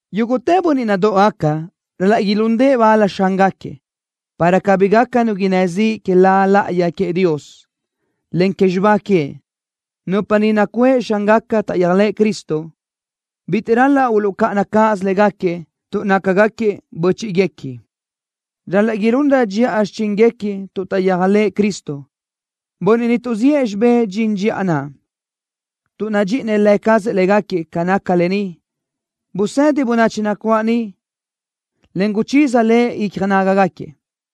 Yúguʼtë bönniʼ nadóʼogaca ral-laʼ ilúndëʼë bal xángaquiëʼ, para cabí gaca nu innë́ ziʼ que La láʼayi queëʼ Dios, en que xibá queëʼ. Nupa niʼ nacuʼë xángaca taʼyéajlëʼë Cristo, bitiʼ ral-laʼ uluʼcáʼana cáʼasö légaquiëʼ tuʼ nácagaquiëʼ bö́chiʼguequi. Ral-laʼ ilunrö dxiʼa xichíngaquiëʼ tuʼ taʼyéajlëʼë Cristo, bönniʼ niʼ tuʼziʼë xibé dxin dxiʼa naʼ, tuʼ nadxíʼinëʼ Lë cazëʼ légaquiëʼ. Ca naca lë ni, busëdi bönachi nacuáʼ niʼ, en guchiza le icja nágagaquiëʼ.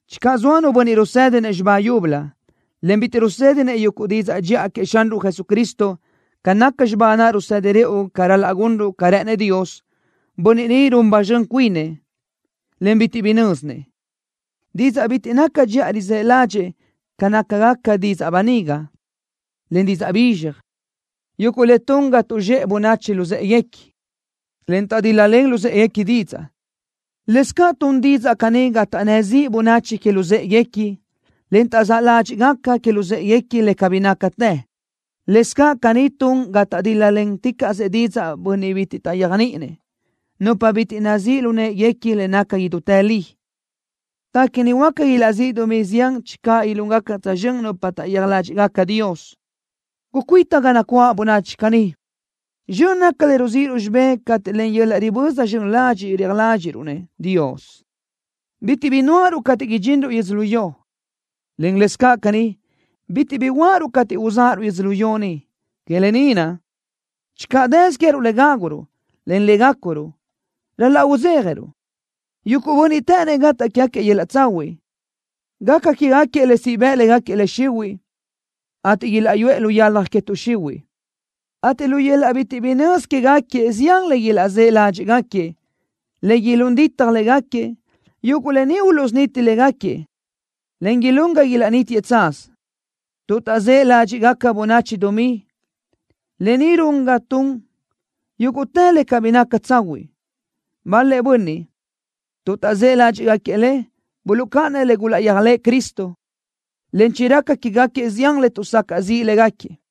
Channö zoa nu bönniʼ rusë́dinëʼ xibá yúbölö, en bitiʼ rusë́dinëʼ yuguʼ didzaʼ dxiʼa queëʼ Xanruʼ Jesucristo, ca naca xibá naʼ rusedi rëʼu ca ral-laʼ gunruʼ ca rë́ʼënëʼ Dios, bönniʼ ni run ba zxön cuinëʼ, en bitiʼ bi nö́zinëʼ. Didzaʼ bitiʼ naca dxiʼa rizë́ ládxëʼë ca nácagaca didzaʼ böniga, en didzaʼ bizxaj, yuguʼ le tun ga tuʼzxéʼe bönachi luzë́ʼeguequi, en taʼdíl-lalen luzë́ʼeguequi didzaʼ. Lëscaʼ tun didzaʼ caní ga taʼnnë́ ziʼ bönachi que luzë́ʼeguequi, en taʼzáʼ ládxiʼgaca que luzë́ʼeguequi le cabí nácatë. Lëscaʼ caní tun ga taʼdíl-laticaʼsëʼ didzaʼ bönniʼ bitiʼ taʼyéajniʼinëʼ, nupa bitiʼ nazíʼ lu në́ʼeguequi le naca idútë li. Téquini huáca ilaʼzíʼ dumí zián channö ilúngaca tsözxö́n nupa taʼyéaj ládxiʼgaca Dios. Gucuíta ga nacuáʼ bönachi caní. Zxön naca le ruzíʼiruʼ xibé cateʼ len yöl-laʼ riböza zxön ladxiʼ reaj ládxiʼruʼ-nëʼ Dios. Bitiʼ bi nuáʼaruʼ cateʼ ridxinruʼ yödzölió, en lëscaʼ caní, bitiʼ bi uáʼaruʼ cateʼ uzáʼaruʼ yödzölió ni. Que lë ni naʼ, channö dësö queë́ruʼ le gáguruʼ, en le gácuruʼ, ral-laʼ udzéjaruʼ. Yuguʼ bönniʼ të́ʼënnëʼ gataʼ quégaquiëʼ yöl-laʼ tsahuiʼ, gaca quégaquiëʼ le siʼ bëʼ légaquiëʼ le xihuiʼ, ateʼ ilaʼyuʼë lu yalaj que tuʼ xihuiʼ, ateʼ lu yöl-laʼ bitiʼ bi nözi quégaquiëʼ zián le ilaʼzë́ ládxiʼgaquiëʼ, le ilún ditaj légaquiëʼ. Yuguʼ lë ni uluʼsuniti légaquiëʼ, en ilún ga ilaʼnítiëʼ tsaz. Tuʼ taʼzë́ ládxiʼgaca bönachi dumí, lë ni run ga tun yúguʼtë le cabí naca tsahuiʼ. Bal-lëʼ bönniʼ, tuʼ taʼzë́ ládxiʼgaquiëʼ le, buluʼcáʼanëʼ le gulaʼyéajlëʼë Cristo, en chiraca quégaquiëʼ zián le tuʼsacaʼ ziʼ légaquiëʼ.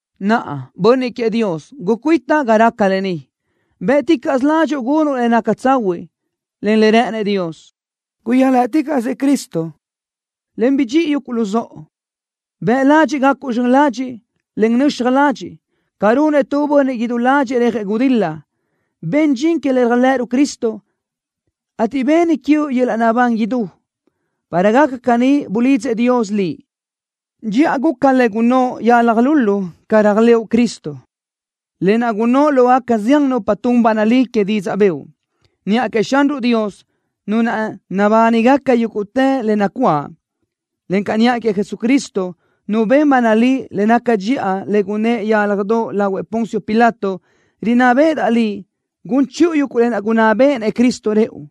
Naʼa, bönniʼ queëʼ Dios, gucuíta ga raca le caní. Bë́ʼticaʼsö ládxuʼu gunuʼ le naca tsahuiʼ, en le rë́ʼënëʼ Dios. Guyéajlëʼticaʼsëʼ Cristo, en bidxíʼi yuguʼ luzóʼo. Bëʼ ladxiʼ gacuʼ zxön ladxiʼ, en nöxaj ladxiʼ. Ca runëʼ tu bönniʼ idú ládxëʼë rejëʼ gudil-la, ben dxin que le réajlëʼëruʼ Cristo, ateʼ beni quiuʼ yöl-laʼ naʼbán idú. Para gaca caní bulidzëʼ Dios liʼ. Dxiʼa guca le gunnóʼ yalaj lulu ca réajlëʼu Cristo, lë naʼ gunnóʼ lógaca zián nupa tun ba nalí que didzaʼ bëʼu. Niʼa queëʼ Xanruʼ Dios, Nu naʼ nabánigaca yúguʼtë le nacuáʼ, encaʼ niʼa queëʼ Jesucristo, Nu ben ba nalí le naca dxiʼa le gunnë́ʼ yálajdoʼ lahuëʼ Poncio Pilato, rinná béʼedaʼ liʼ gun chiʼu yuguʼ lë naʼ gunná béʼenëʼ Cristo rëʼu.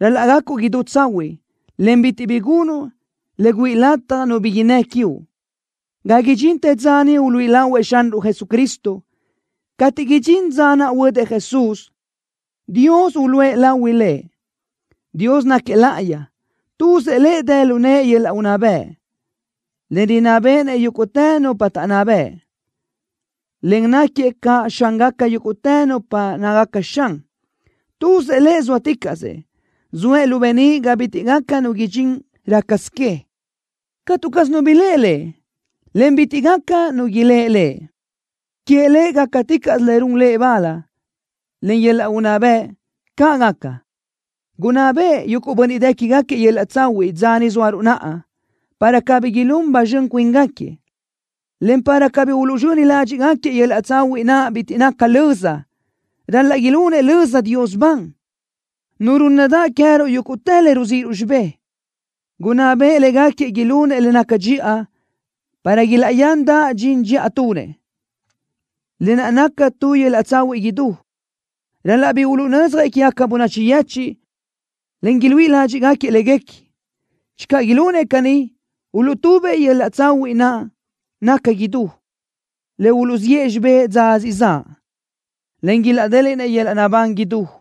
Ral-laʼ gacuʼ idú tsahuiʼ, en bitiʼ bi gunuʼ le güíʼi lataj nu bi innë́ quiuʼ, ga idxintë dza niʼ uluíʼi lahuëʼ Xanruʼ Jesucristo. Cateʼ idxín dza naʼ huödëʼ Jesús, Dios uluʼë lahui Lëʼ. ¡Dios náquiëʼ láʼayi! ¡Tuzëʼ Lëʼ dë lu nëʼë yöl-laʼ unná bëʼ, en rinná béʼenëʼ yúguʼtë nupa taʼnná bëʼ, en náquiëʼ caʼ Xángaca yúguʼtë nupa nácagaca xan! ¡Tuzëʼ Lëʼ zóaticaʼsëʼ! ¡Zoëʼ lu beníʼ ga bitiʼ gaca nu idxín rácasö que! ¡Catu caz nu biléʼe Lëʼ, en bitiʼ gaca nu iléʼe Lëʼ! ¡Queëʼ Lëʼ gácaticaʼsö le run Lëʼ bal, en yöl-laʼ unná bëʼ! ¡Caʼ gaca! Gunná beʼe yuguʼ bönniʼ dë quégaquiëʼ yöl-laʼ tsahuiʼ dza ni zóaruʼ naʼa, para cabí ilún ba zxön cuíngaquiëʼ, en para cabí uluʼzxöni ládxiʼgaquiëʼ yöl-laʼ tsahuiʼ naʼ bitiʼ naca löza. ¡Ral-laʼ ilunëʼ löza Dios ban, Nu rúnnadaʼ queë́ruʼ yúguʼtë le ruzíʼiruʼ xibé! Gunná beʼe légaquiëʼ ilunëʼ le naca dxiʼa, para ilaʼyandaʼ dxin dxiʼa tunëʼ, lë naʼ naca tu yöl-laʼ tsahuiʼ idú. Ral-laʼ bi uluʼnödzjëʼ quégaca bönachi yechiʼ, en iluíʼi ládxiʼgaquiëʼ léguequi. Channö ilunëʼ caní, uluʼtubëʼ yöl-laʼ tsahuiʼ naʼ naca idú, le uluʼziʼë xibé dza siʼ zaʼ, en ilaʼdéliʼnëʼ yöl-laʼ naʼbán idú.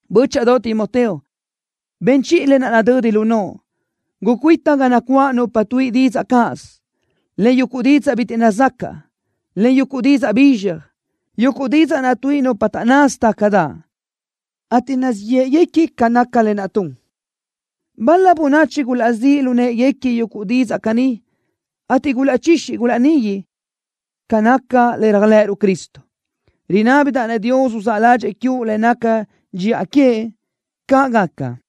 Bö́chaʼadoʼ Timoteo, ben chiʼi le nadödi lu noʼo. Gucuíta ga nacuáʼ nupa tuíʼi didzaʼ cáʼasö, en yuguʼ didzaʼ bitiʼ nazacaʼ, en yuguʼ didzaʼ bizxaj, yuguʼ didzaʼ naʼ tuíʼi nupa taʼnnasö tácadaʼ, ateʼ nazíʼ yéʼeguequi ca naca lë naʼ tun. Bal-la bönachi gulaʼzíʼ lu në́ʼeguequi yuguʼ didzaʼ caní, ateʼ gulaʼchixi gulaʼnigui ca naca le réajlëʼëruʼ Cristo. Rinábidaʼ-nëʼ Dios uzáʼ ládxëʼë quiuʼ le nácagaca dxiʼa queëʼ. ¡Caʼ gaca!